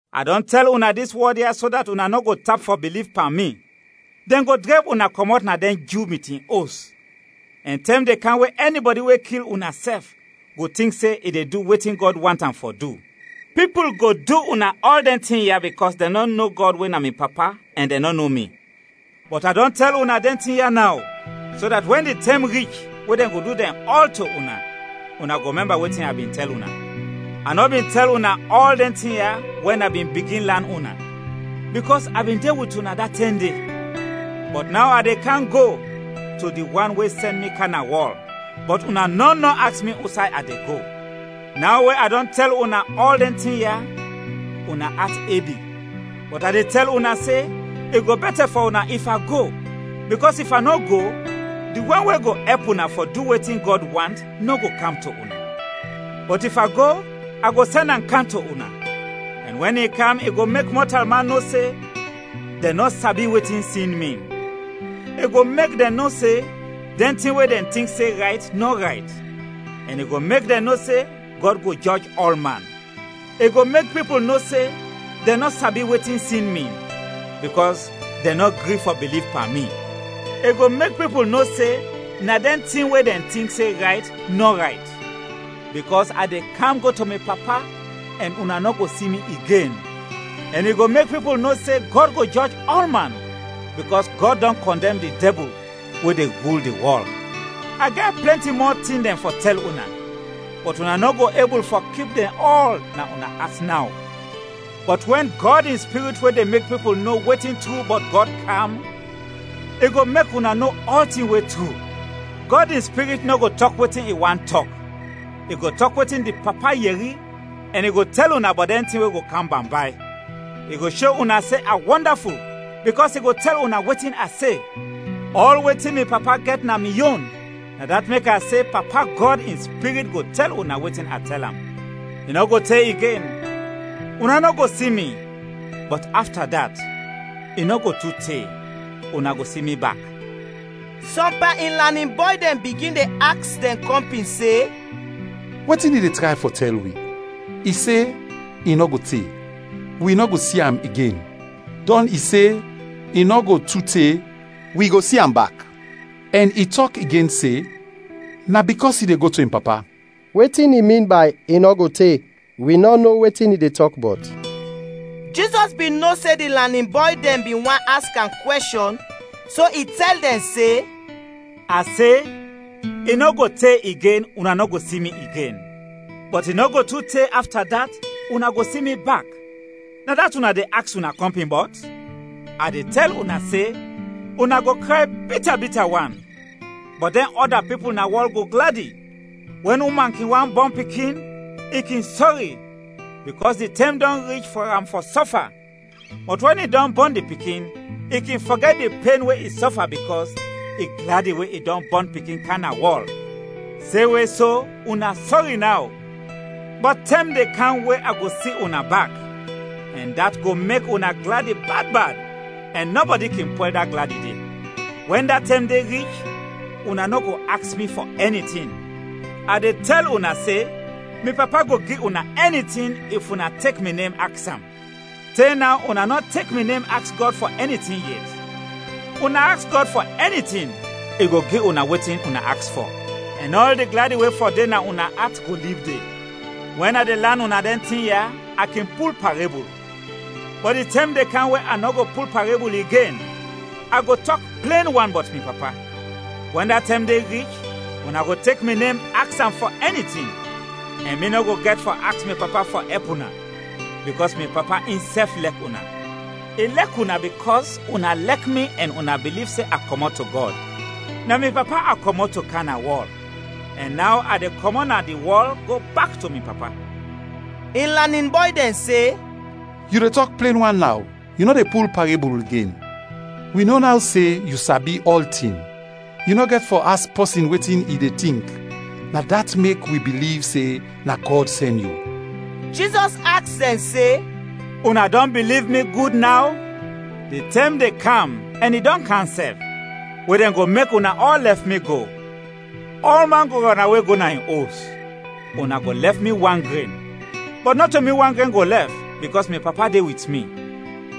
“A dɔn tɛl una dis wɔd ya so dat una nɔ go tap fɔ biliv pan mi. Dɛn go drɛb una kɔmɔt na dɛn Ju mitin os, ɛn tɛm de kam we ɛnibɔdi we kil una sɛf go tink se i de du wetin Gɔd want am fɔ du. Pipul go du una ɔl dɛn tin ya bikɔs dɛn nɔ no Gɔd we na mi Papa ɛn dɛn nɔ no mi. Bɔt a dɔn tɛl una dɛn tin ya naw, so dat wɛn di tɛm rich we dɛn go du dɛn ɔl to una, una go mɛmba wetin a bin tɛl una. “A nɔ bin tɛl una ɔl dɛn tin ya wɛn a bin bigin lan una, bikɔs a bin de wit una da tɛm de. Bɔt naw a de kam go to di wan we sɛn mi kam na wɔl, bɔt una nɔn nɔ aks mi usay a de go. Naw we a dɔn tɛl una ɔl dɛn tin ya, una at ebi. Bɔt a de tɛl una se, i go bɛtɛ fɔ una if a go, bikɔs if a nɔ go, di wan we go ɛp una fɔ du wetin Gɔd want nɔ go kam to una. Bɔt if a go, a go sɛn am kam to una. Ɛn wɛn i kam i go mek mɔtalman no se dɛn nɔ sabi wetin sin min; i go mek dɛn no se dɛn tin we dɛn tink se rayt, nɔ rayt; ɛn i go mek dɛn no se Gɔd go jɔj ɔlman. I go mek pipul no se dɛn nɔ sabi wetin sin min, bikɔs dɛn nɔ gri fɔ biliv pan mi. I go mek pipul no se na dɛn tin we dɛn tink se rayt, nɔ rayt, bikɔs a de kam go to mi Papa ɛn una nɔ go si mi igen. Ɛn i go mek pipul no se Gɔd go jɔj ɔlman, bikɔs Gɔd dɔn kɔndɛm di dɛbul we de rul di wɔl. “A gɛt plɛnti mɔ tin dɛn fɔ tɛl una, bɔt una nɔ go ebul fɔ kip dɛn ɔl na una at naw. Bɔt wɛn Gɔd in Spirit we de mek pipul no wetin tru bɔt Gɔd kam, i go mek una no ɔltin we tru. Gɔd in Spirit nɔ go tɔk wetin in want tɔk, i go tɔk wetin di Papa yɛri ɛn i go tɛl una bɔt dɛn tin we go kam bambay. I go sho una se a wɔndaful, bikɔs i go tɛl una wetin a se. Ɔl wetin mi Papa gɛt na mi yon, na dat mek a se Papa Gɔd in Spirit go tɛl una wetin a tɛl am. “I nɔ go te igen, una nɔ go si mi, bɔt afta dat, i nɔ go tu te, una go si mi bak.” Sɔm pan in lanin bɔy dɛn bigin de aks dɛn kɔmpin se, “Wetin i de tray fɔ tɛl wi? I se, i nɔ go te, wi nɔ go si am igen, dɔn i se, i nɔ go tu te, wi go si am bak; ɛn i tɔk igen se, ‘Na bikɔs i de go to in Papa’. Wetin i min bay ‘i nɔ go te?’ Wi nɔ no wetin i de tɔk bɔt!” Jizɔs bin no se di lanin bɔy dɛn bin want aks am kwɛshɔn, so i tɛl dɛn se, “A se, ‘I nɔ go te igen una nɔ go si mi igen, bɔt i nɔ go tu te, afta dat, una go si mi bak’. Na dat una de aks una kɔmpin bɔt? A de tɛl una se: Una go kray bita bita wan, bɔt dɛn ɔda pipul na wɔl go gladi. Wɛn uman kin want bɔn pikin, i kin sɔri, bikɔs di tɛm dɔn rich fɔ am fɔ sɔfa; bɔt wɛn i dɔn bɔn di pikin, i kin fɔgɛt di pen we i sɔfa bikɔs i gladi we i dɔn bɔn pikin kam na wɔl. Semwe so, una sɔri naw, bɔt tɛm de kam we a go si una bak, ɛn dat go mek una gladi bad bad ɛn nɔbɔdi kin pwɛl da gladi de. “Wɛn da tɛm de rich, una nɔ go aks mi fɔ ɛni tin. A de tɛl una se: Mi Papa go gi una ɛni tin, if una tek mi nem aks am. Te naw una nɔ tek mi nem aks Gɔd fɔ ɛni tin yet; una aks Gɔd fɔ ɛni tin i go gi una wetin una aks fɔ, ɛn ɔl di gladi we fɔ de na una at go lib de. “Wɛn a de lan una dɛn tin ya, a kin pul parebul. Bɔt di tɛm de kam we a nɔ go pul parebul igen, a go tɔk plen wan bɔt mi Papa. Wɛn da tɛm de rich, una go tek mi nem aks am fɔ ɛni tin, ɛn mi nɔ go gɛt fɔ aks mi Papa fɔ ɛp una, bikɔs mi Papa insɛf lɛk una. I lɛk una bikɔs una lɛk mi ɛn una biliv se a kɔmɔt to Gɔd. Na mi Papa a kɔmɔt to kam na wɔl, ɛn naw a de kɔmɔt na di wɔl go bak to mi Papa.” In lanin bɔy dɛn se, “Yu de tɔk plen wan naw, yu nɔ de pul parebul igen. Wi no naw se yu sabi ɔltin, yu nɔ gɛt fɔ aks pɔsin wetin i de tink; na dat mek wi biliv se na Gɔd sɛn yu.” Jizɔs aks dɛn se, “Una dɔn biliv mi gud naw? Di tɛm de kam ɛn i dɔn kam sɛf, we dɛn go mek una ɔl lɛf mi go; ɔlman go rɔnawe go na in os, una go lɛf mi wan gren. Bɔt nɔto mi wan gren go lɛf, bikɔs mi Papa de wit mi.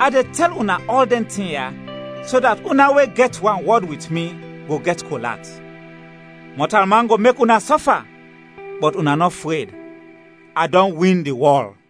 A de tɛl una ɔl dɛn tin ya so dat una we gɛt wanwɔd wit mi go gɛt kol at. Mɔtalman go mek una sɔfa, bɔt una nɔ fred! A dɔn win di wɔl!”